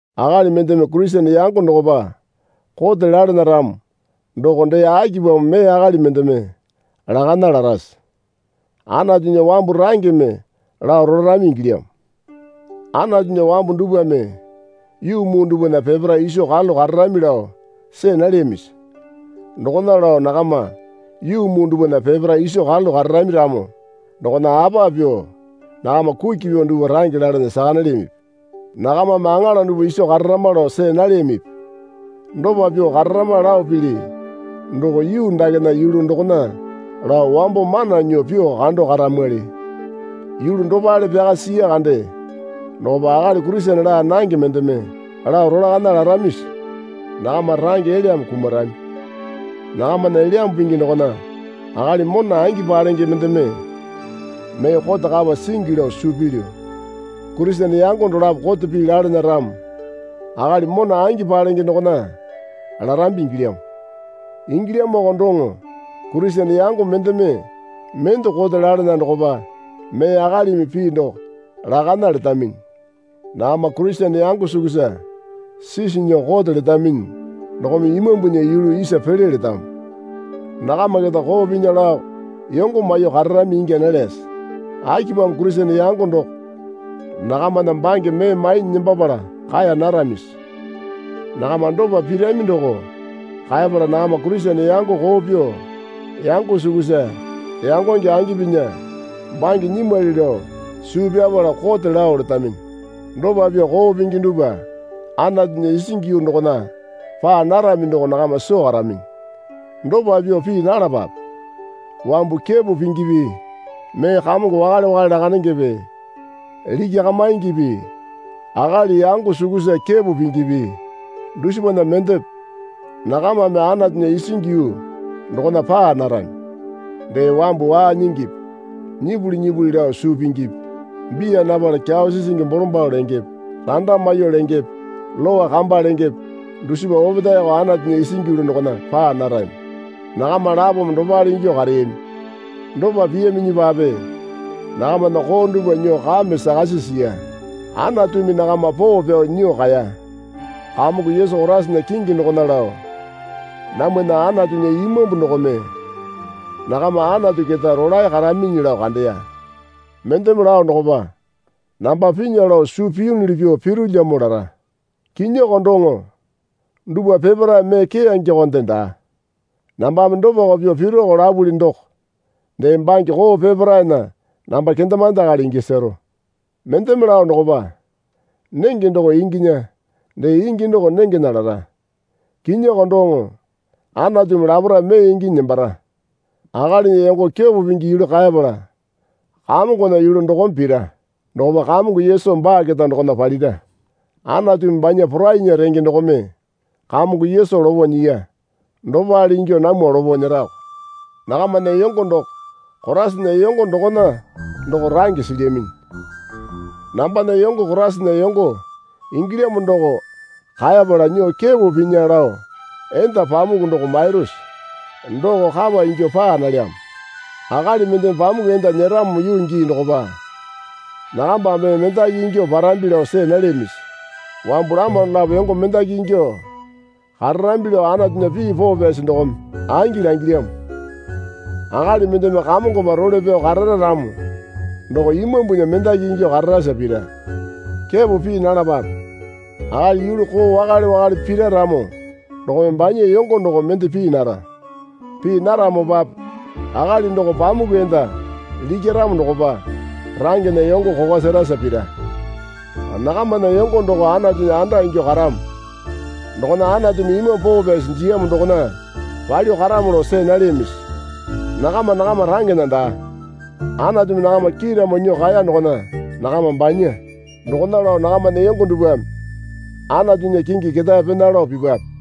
Akali mendeme Kurisene yango dokopa kote lalana ramo doko dee akipamo mee akali mendeme lakana larase? Anatunya wambu rangeme lao rolarami ingilyamo. Anatunya wambu dupwame yuu muu dupwana peparae iso karalu kararami lao see nalyamisi? Dokona lao nakama yuu muu dupwana peparae iso karalu kararami ramo dokona apa pyuo nakama kuki pyuo dupwa range lalana saka nalyamipi? Nakamame aŋala dupwa iso kararama lao see nalyamipi? Dopa pyuo kararama lao pili doko yuu dakena yulu dokona lao wambo mana nyuo pyuo kando karamwali. Yulu dopale pyaka siya kande dokopa akali Kurisene laa nange mendeme lao rolakana laramisi? Nakama range elyame kumarami. Nakamana Elyambu Pingi dokona akali mona angi palenge mendeme mee kote kapa singi lao suu pilyu. Kurisene yango dolapo kote pii lalana ramo akali mona angi palenge dokona larambi ingilyamo. Ingilyamoko doŋo Kurisene yango mendeme mende kote lalana dokopa mee akalimi pii doko lakana letaminyi. Nakama Kurisene yango sukusa sisi nyuo kote letaminyi dokome Imambunya yulu isa pele letamo. Nakama keta koo pinya laoko yongo maiyuo kararami ingya nalyase? Akipamo Kurisene yango doko nakamana bange mee mainyi nembapala kaeya naramisi? Nakama dopa pirami doko kaepala nakama Kurisene yango koo pyuo yango sukusa yangonge angi pinya bange nyimwali lao suu pyapala kote lao letaminyi. Dopa pyuo koo pingi dupwa Anatuya isingi yuu dokona paa narami doko nakama soo karaminyi. Dopa pyuo pii nalapape. Wambu kepo pingipi mee kamongo wakale wakale lakandengepe likyakamingipi akali yango sukusa kepo pingipi dusipana mendepe nakamame Anatunya isingi yuu dokona paa narami. Dee wambu waa nyingipi nyipuli nyipuli lao suu pingipi biya napala kyawa sisingi bolombalo lengepe randa maiyuo lengepe lowa kamba lengepe dusipa opetaeyoko Anatunya isingi yuu dokona paa narami. Nakama lapome dopale ingyuo kareyami. Dopa piyaminyipape nakamana koo dupwa nyuo kame sakasi siya. Anatumi nakama poo pyao nyuo kaeya. Kamongo Yesu Koraisana kingi dokona lao namwana Anatunya Imambu dokome nakama Anatu keta rolae karaminyi lao kandeya. Mendeme lao dokopa, Namba pinya lao suu piyunuli pyuo pirulyamo lara. Kinyiyoko doŋo dupwa peparae mee keyangekonde daa. Nambame dopako pyuo pirako lapuli doko dee bange koo peparaena namba kendemande akali ingya sero. Mendeme lao dokopa, nenge doko inginya dee ingi doko nengena lara. Kinyioko doŋo. Anatumi laparae mee inginyi nembara. Akalinya yongo kepo pingi yulu kaepala Kamongona yulu dokome pira. Dokopa Kamongo Yesu baa keta dokona palira. Anatumi banya porainya renge dokome Kamongo Yesu lopo nyiya. Dopale ingyuo namwa lopo nyerako. Nakamana yongo doko Koraisana yongo dokona doko range silyaminyi. Nambana yongo Koraisana yongo ingilyamo doko kaepala nyuo kepo pinya lao enda pamuku doko mairusi? Doko kapa ingyuo paa nalyamo. Akali mendeme pamuku enda nyeramo yuu gii dokopa nakamba mee mendaki ingyuo parambi lao see nalyamisi? Wambu lama dolapo yongo mendaki ingyuo kararambi lao Anatunya pii poo pyasi dokome angi langilyamo. Akali mendeme Kamongopa role pyao karara ramo doko imambunya mendaki ingyuo kararasa pira. Kepo pii nalapape. Akali yulu koo wakale wakale pira ramo dokome banya yongo doko mende pii nara. Pii naramopape akali doko pamuku enda likyaramo dokopa rangena yongo kokwa serasa pira. Nakamana yongo doko Anatunya anda ingyuo karamo. Dokona Anatumi Imambu Poo Pyasi jiyamo dokona palyuo karamo lao see nalyamisi? Nakama nakama rangena daa, Anatumi nakama kiiramo nyuo kaeya dokona nakama banya. Dokona lao nakamana yongo dupwame Anatunya kingi ketae pena lao pipwape.